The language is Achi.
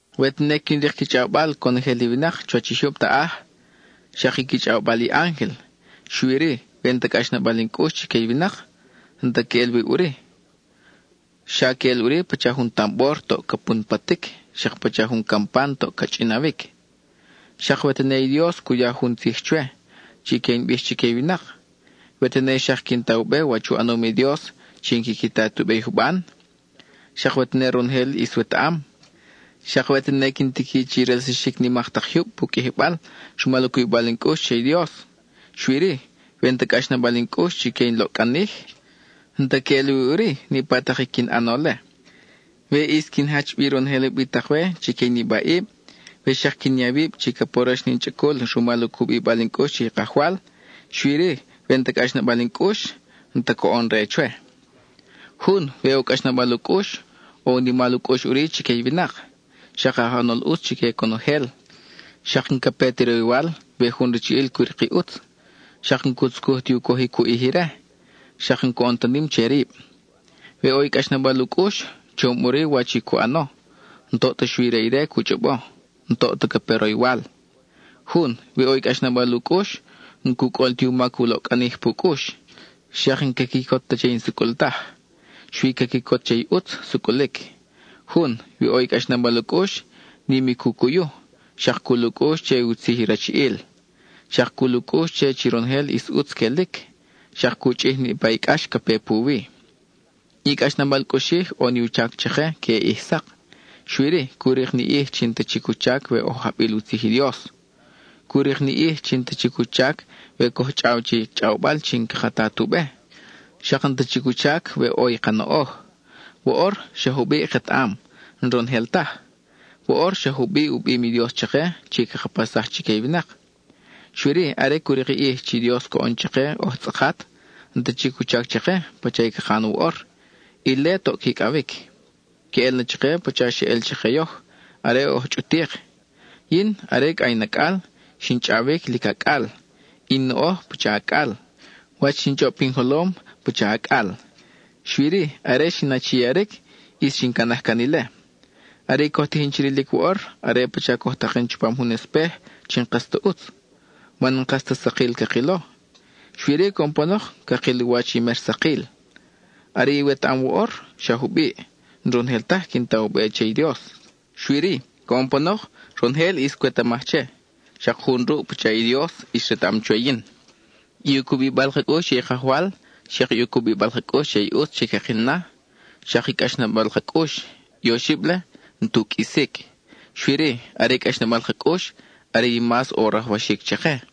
We tene quin rik qui chʼawbal conojel i winak chuwach i jyub taʼaj, xak i qui chʼawbal i ángel, xui-ri, we n-ta cʼaxnabal in cʼux chique i winak, n-ta queʼel wi ʼuri; xa queʼel ʼuri pacha jun tambor toʼ ca punpatic, xak pacha jun campan toʼ ca chʼinawic. Xak we tene i Dios cu ya jun tzij chwe, chi que in bij chique i winak; we tene xak quin ta u be wach u ʼanom i Dios chi n-quiqui ta tu be i juban; xak we tene ronojel ʼis wetaʼam; xak we tene quin tiqui chi relsaxic nimak tak jyub pu qʼuijibal rumal u cubibal in cʼux che i Dios; xui-ri, we n-ta cʼaxnabal in cʼux chique in loʼcʼanij, n-ta queʼel wi ʼuri niʼpa tak i quin ʼano-le. We ʼis quin jach bi ronojel ubitak-we chique i nibaʼib, we xak quin ya wib chi ca porox na in chʼacul rumal u cubibal in cʼux che i Kajwal, xui-ri we n-ta cʼaxnabal in cʼux, n-ta coʼon re chwe. Jun, we ʼo cʼaxnabal u cʼux, ʼo u nimal u cʼux ʼuri chique i winak, xak aj ʼanol ʼutz chique conojel; xak n-ca pe ti roywal we jun rachiʼil cu rik i ʼutz; xak n-cu tzucuj ti u cojic u ʼij ire, xak n-coʼon ta nim che rib. We ʼo i cʼaxnabal u cʼux, chom ʼuri wach i cu ʼano, n-toʼ ta xui re ire cu chʼobo, n-toʼ ta ca pe roywal. Jun, we ʼo i cʼaxnabal u cʼux, n-cu cʼol ti u mac u loʼcʼanij pu cʼux. Xak n-ca quicot ta che i n-sucʼul taj, xui ca quicot che i ʼutz sucʼulic. Jun, we ʼo i cʼaxnabal u cʼux, nim i cu cuyu; xak cul u cʼux che u tzij i rachiʼil; xak cul u cʼux che chi ronojel ʼis ʼutz quelic; xak cu chʼij niʼpa i cʼax ca pe puwi. I cʼaxnabal cʼuxij ʼo ni u chac chake queʼe ʼij sak. Xui-ri, cu rik ni ʼij chi n-ta chic u chac we oj ajbil u tzij i Dios; cu rik ni ʼij chi n-ta chic u chac we coj chʼaw che i chʼawbal chi n-caka ta tu be; xak n-ta chic u chac we ʼo i ka noʼoj. Woʼor, xa jubiʼ ketaʼam, n-ronojel taj; woʼor xa jubiʼ u bim i Dios chake chi caka paxsaj chique i winak. Xui-ri, are cu rik i ʼij chi Dios coʼon chake oj tzʼakat, n-ta chic u chac chake pacha i caka ʼan woʼor, ile toʼ quicʼawic. (Queʼel na chake pacha xeʼel chake yoj, are oj chʼutik): yin, are cʼa in acʼal, xin chʼawic lic acʼal, i in noʼoj pacha acʼal, wach xin chʼob pin jolom, pacha acʼal. Xui-ri, are xin achiaric, ʼis xin canaj can ile. Are i coj tijin chi rilic woʼor, are pacha coj taken chupam jun espej chi n-kas ta ʼutz, man n-kas ta sakil cakilo; xui-ri coʼon panok, cakil u wach i mer sakil. Are i wetaʼam woʼor, xa jubiʼ; n-ronojel taj quin ta u be che i Dios. Xui-ri, coʼon panok, ronojel ʼis cwetamaj che, xak jun ruʼ pacha i Dios ʼis retaʼam chwe yin. I u cubibal ka cʼux che i Kajwal, xak i u cubibal ka cʼux che i ʼutz chi cakil na, xak i cʼaxnabal ka cʼux, i oxib-le n-tu qʼuisic; xui-ri, are i cʼaxnabal ka cʼux are i mas ʼo rajwaxic chake.